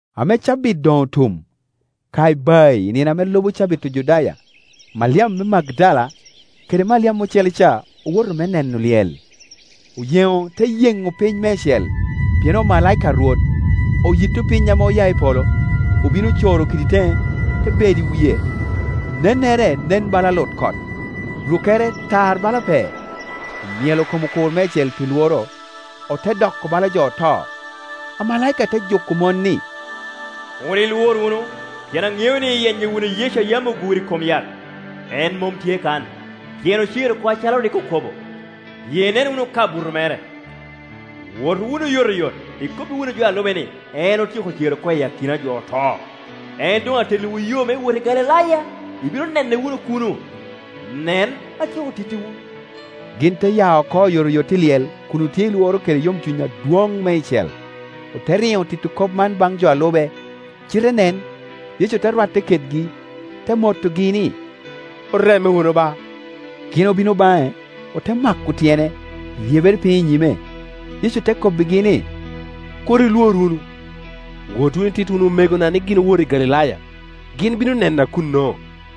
Ame cabit doŋ otum, ka ibayi i nino ame lubo cabit Ojudaya. Maliam me Magdala kede Maliam ocele ca owoto me neno lyel. Oyeŋo te yeŋo piny meicel, pien omalaika a Rwot oyitto piny ame oya i polo, obino ocoro kidi teŋe, te bedo i wie. Nennere nen bala lutkot, rukkere tar bala pee. Omyelo kom okur meicel pi lworo, ote doko bala jo oto. Amalaika te juko mon, ni, “Kur ilwor wunu; pien aŋeo ni iyenyo wunu Yecu a yam oguro i kom yat. En mom tye kan, pien ocer oko acalo rik okobo. Biye inen wunu ka buto mere. Wot wunu oyotoyot, ikobbi wunu jo a lube ni, en otyeko cer oko i akina jo oto. En doŋ atelliwu yo me wot i Galilaya, ibino nene wunu kuno. Nen, atyeko tittiwu.” Gin te ya oko oyotoyot i lyel kun otye i lworo kede yomcuny adwoŋ meicel, ote riŋo tito kop man baŋ jo a lube. Cite nen, Yecu te rwatte kedgi, te motogi ni, “Oreme wunu ba,” Gin obino baŋe, ote mako tyene, ryebere piny i nyime. Yecu te kobbigi ni, “Kur ilwor wunu; wot wunu, ititti wunu omegona ni gin owot i Galilaya, gin bino nena kuno.”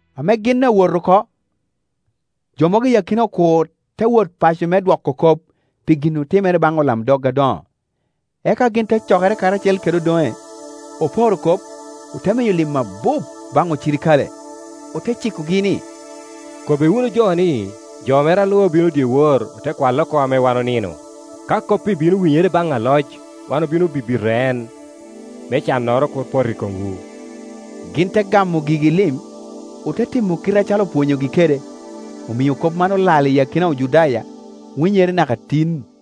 Ame gin awot oko, jo mogo i akina okur te wot paco me dwoko kop pi gin otimere baŋ olamdog adoŋo. Eka gin te cokere karacel kede odoŋe, oporo kop, ote miyo lim abup baŋ ocirikale, ote cikogi ni, “Kobbi wunu jo ni, ‘Jo mere a lube obino dyewor, ote kwale oko ame wan onino.’ Ka kop-pi bino winyere baŋ aloc, wan obino bibito en, me cannoro kur pot i komwu.” Gin te gamo gigi lim, ote timo kite acalo opwonyogi kede; omio kop man olal i akina Ojudaya, winyere naka tin.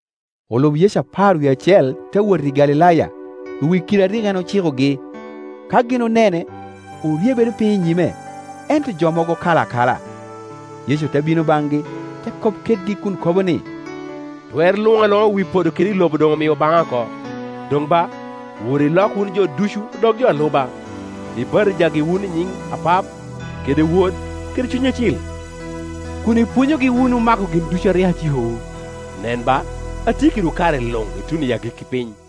Olub Yecu apar wie acel te wot i Galilaya, i wi kidi a rik en ocikogi. Ka gin onene, oryebere piny i nyime, ento jo mogo okalo akala. Yecu te bino baŋgi, te kop kedgi kun kobo ni, “Twer luŋ aluŋa i wi podo kede i lobo doŋ omio baŋa oko. Doŋ ba, wot ilok wunu jo ducu odok jo a luba; ibatijagi wunu i nyiŋ Apap, kede Wod, kede Cuny Acil, kun ipwonyogi wunu mako gin ducu a rik acikowu. Nen ba, atye kedwu kare luŋ, ituno i agikki piny.”